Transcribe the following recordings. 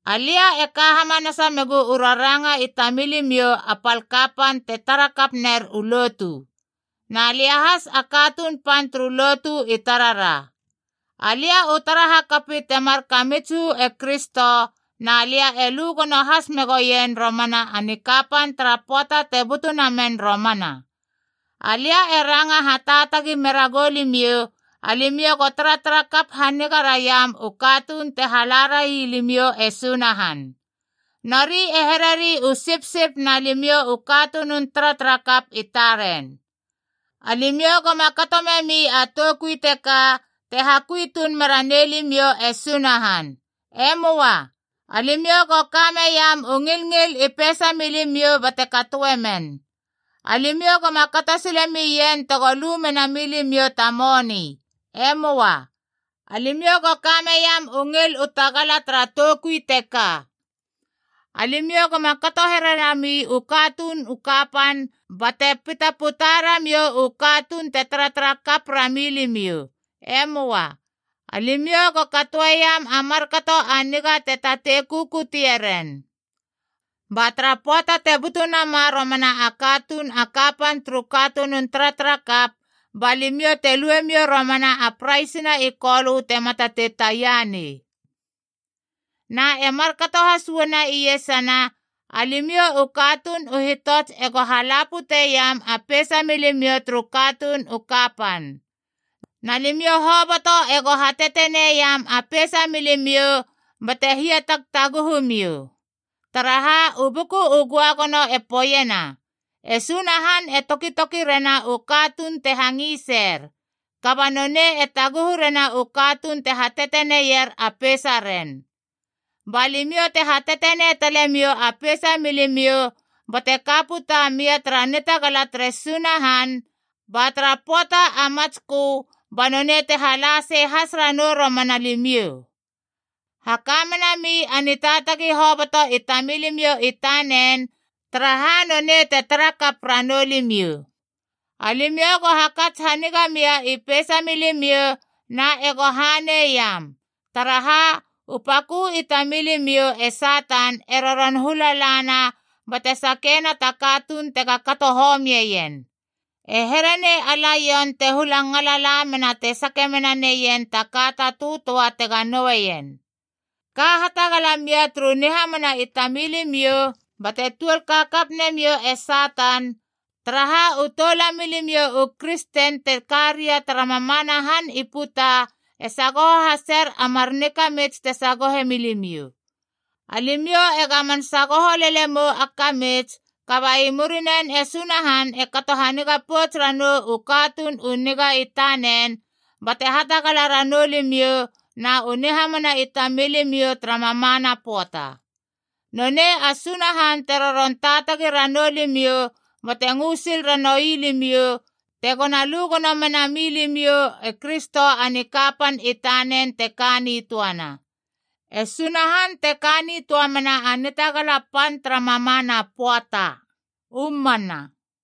Alia e ka hamanasa megu u raranga i tamilimiou a pal kapan te tara kap ner u lotu. Na lia has a katuun pan turu lotu i tarara. Alia u tara hakapi temar kamits uu e Kristo, na lia e lu gono has megoen romana a nikapan tara pöata te butu namen romana. Alia e ranga hataatagi mera goulimiou, alimiou go taratara kap haniga raiam u katuun te hala railimiou e Sunahan. Nori e hereri u sipsip na limiou u katunun taratarakap i taren. Alimiou goma kato memi a toukui teka te hakui tuun mera nei limiou e Sunahan. E möa. Alimiou go ka meiam u ngilngil i peisa milimiou bate katoe men. Alimiou goma kato sile mien tego lu mena milimiou ta moni. E möa. Alimiou go kame iam u ngil u tagala tara toukui teka. Alimiou goma kato here rami u katuun u kapan bate pita puta ramiou u katuun te taratara kap rami limiou. E möa. Alimiou go katoeiam a markato a niga te tatei kukutieren. Ba tara pöata te butu nama romana a katuun a kapan turu katunun taratarakap, ba limiou te luemiou romana a praisina i Kolö tema tatei taia nei. Na e markato has uana iesana, alimiou u katuun u hitots ego hala puteiam a peisa milimiou turu katuun u kapan. Na limiou hoboto ego hateteneiam a peisa milimiou bate hiatagtaguhumiou. Taraha, u Buku u Göagono e poeiena, “E Sunahan e tokitoki rena u katuun te hangiser, kaba nonei e taguhu rena u katuun te hateteneier a peisaren.” Ba limiou te hatetenei talemiou a peisa milimiou bate ka puta mia tara nitagala tere Sunahan, ba tara pöata a matskö ba nonei te hala sei has ranou romana limiou. Haka menami a nitaatagi hoboto i tamilimiou i tanen, taraha nonei te tarakap ranou limiou. Alimiou go hakats haniga mia i peisamilimiou, na ego haneiam! Taraha, u pakö i tamilimiou e Satan e roron hula lana bate sakeiena ta katuun tega kato homien. E here nei a laion te hula ngala lamena te sake menaneien ta ka ta töatöa tega noueien. Ka hatagala mia turu nihamana i tamilimiou bate tuol kakap nemiou e Satan, taraha u toulamilimiou u kristen te ka ria tara mamana han i puta e sagoho haser a mar nikamits te sagohe milimiou. Alimiou e gamon sagoho lele mou a kamits, kaba i murinen e Sunahan e kato haniga pouts ranou u katuun u niga i tanen bate hatagala ranou limiou na u nihamana i tamilimiou tara mamana pöata. Nonei a Sunahan te roron taatagi ranou limiou bate ngö sil ranoui limiou tego na lu gono menami limiou e Kristo a nikapan i tanen te ka nitöana. E Sunahan te ka nitöa mena a nitagala pan tara mamana pöata. U mana.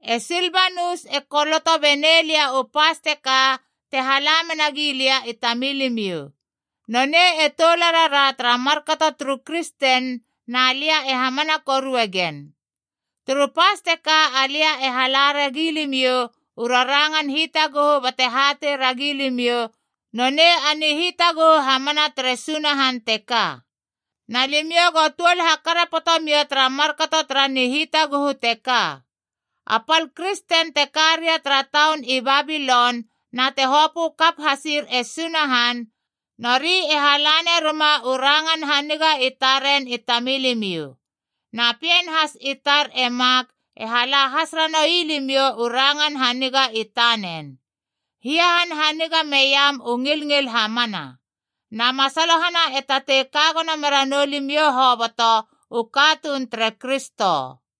E Silbanus e koloto benei lia u pas teka te hala menagi lia i tamilimiou. Nonei e toularara tara markato turu kristen na lia e hamana korue gen. Turu pas teka alia e hala ra gilimiou u rarangan hitaguhu bate hatei ragi limiou nonei a nihitaguhu hamana tere Sunahan teka. Na limiou go tuol hakarapoto mia tara markato tara nihitaguhu teka. A pal kristen te ka ria tara taun i Babilon na te hopö kap hasir e Sunahan, nori e hala neruma u rangan haniga i taren i tamilimiou. Na pien has i tar e Mak e hala has ranoui limiou u rangan haniga i tanen. Hiahanhaniga meiam u ngilngil hamana. Na masalohana e tatei ka gono mera noulimiou hoboto u katuun tere Kristo.